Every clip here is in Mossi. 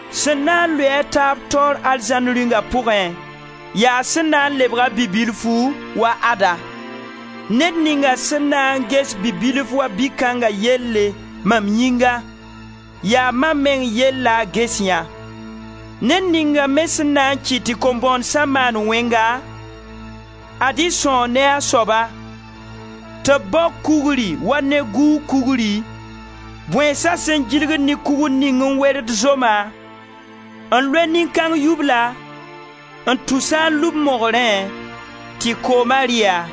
Sẽn na n lʋɩ-a a taab taoor Arzãn Rĩunga pʋgẽ, yaa sẽn na n lebg-a bi-bilfu wa ad-a. Ned ninga sẽn na n ges bi-bilf wa bi-kãnga yelle mam yĩnga, yaa mam meng yell la a ges yã. Ned ninga me sẽn na n kɩt tɩ kom-bõonesã maan wẽnga, ad-y sãoo ne a soaba, tɩ b bao kugri wa neguug kugri, bõeensa sẽn gilgd ne kugr ning n werd zoma, n loe nin-kãng yubla, n tus-a n lub mogrẽ, tɩ kooma rɩ-a.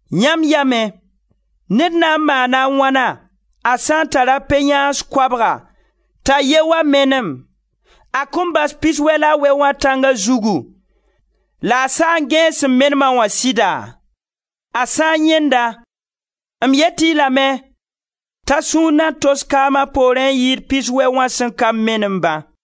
Yãmb yamẽ, ned na n maana a wãna, a sã n tar pe-yãans koabga t'a ye wa menem? A kõn bas piswɛ la a wɛ wã tãnga zugu la a saa n gẽes sẽn menem-a wã sɩda? A sã n yãend-a, m yet-y lame t'a sũur na tos kaam a poorẽ n yɩɩd piswɛ wã sẽn ka menem-ba.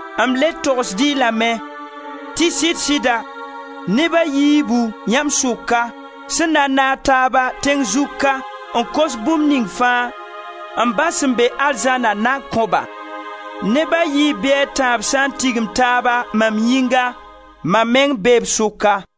M le togsd-y lame tɩ sɩd-sɩda, neb a yiibu, yãmb sʋka, sẽn na n naag taaba, tẽng zugu ka, n kos bũmb ning fãa, m Ba sẽn be arzãna na kõ-ba. Neb a yiib bɩ a tãab sã n tigim taaba, mam yĩnga, mam meng bee b sʋka.»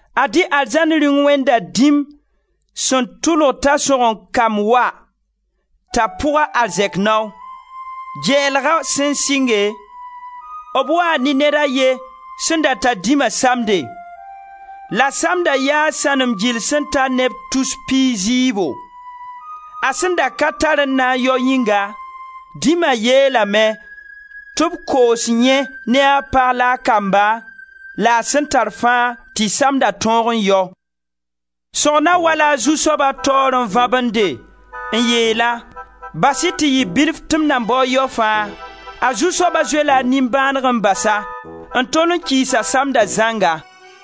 Ad-y Arzãn Rĩung wẽnda dĩm sẽn tʋlg t'a sõgen-kamb wa, t'a pʋg a arzɛk nao. Gɛɛlga sẽn sɩnge, b waa ne ned a ye sẽn tar dĩma samde, la samda yaa sãnem gil sẽn ta neb tus piig zɩɩbo. A sẽn da ka tar n na n yao yĩnga, dĩma yeelame tɩ b koos yẽ ne a pag la a kamba la a sẽn tar fãa, tɩ samda tõog n yao. Sõgna wa-la a zu-soaba taoore n vabende, n yeel-a: ‹Bas-y tɩ yɩ bilf tɩ m na bao n yao fãa.› A zu-soaba zoe-la a nimbãanega n bas-a, n tol kiis a samda zãnga.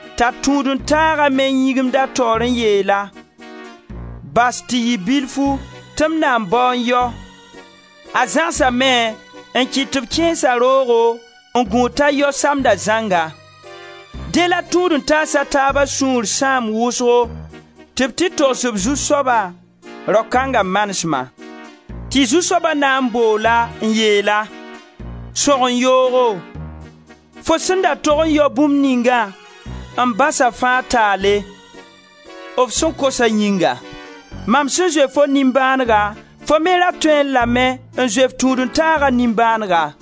T'a tũud-n-taaga me yĩgimd a taoore n yeel-a: ‹Bas tɩ yɩ bilfu, tɩ m na bao n yao.› A zãgsame n kɩt tɩ b kẽes-a roogo, n gũud t'a yao samda zãnga. Dẽ la tũud-n-taas a taaba sũur sãam wʋsgo tɩ b tɩ togs b zu-soaba rao kãng manesma. Tɩ zu-soaba na n bool-a n yeel-a: ‹Sõgen yoogo, fo sẽn da tog n yao bũmb ningã, m basa fãa taale, f sẽn kosa yĩnga. Mam sẽn zoe fo nimbãanega, fo me ra tõee lame n zoe f tũud-n-taaga nimbãanega.›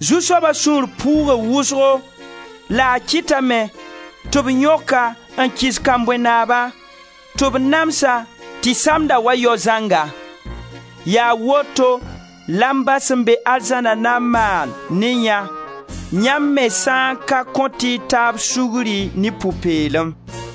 Zu-soaba sũur puuga wʋsgo la a kɩtame tɩ b yõk-a n kɩs kambõe naaba tɩ b nams-a tɩ samda wa yao zãnga. Yaa woto la m Ba sẽn be arzãna na n maan ne yã, yãmb me sã n ka kõt y taab sugri ne pʋ-peelem.»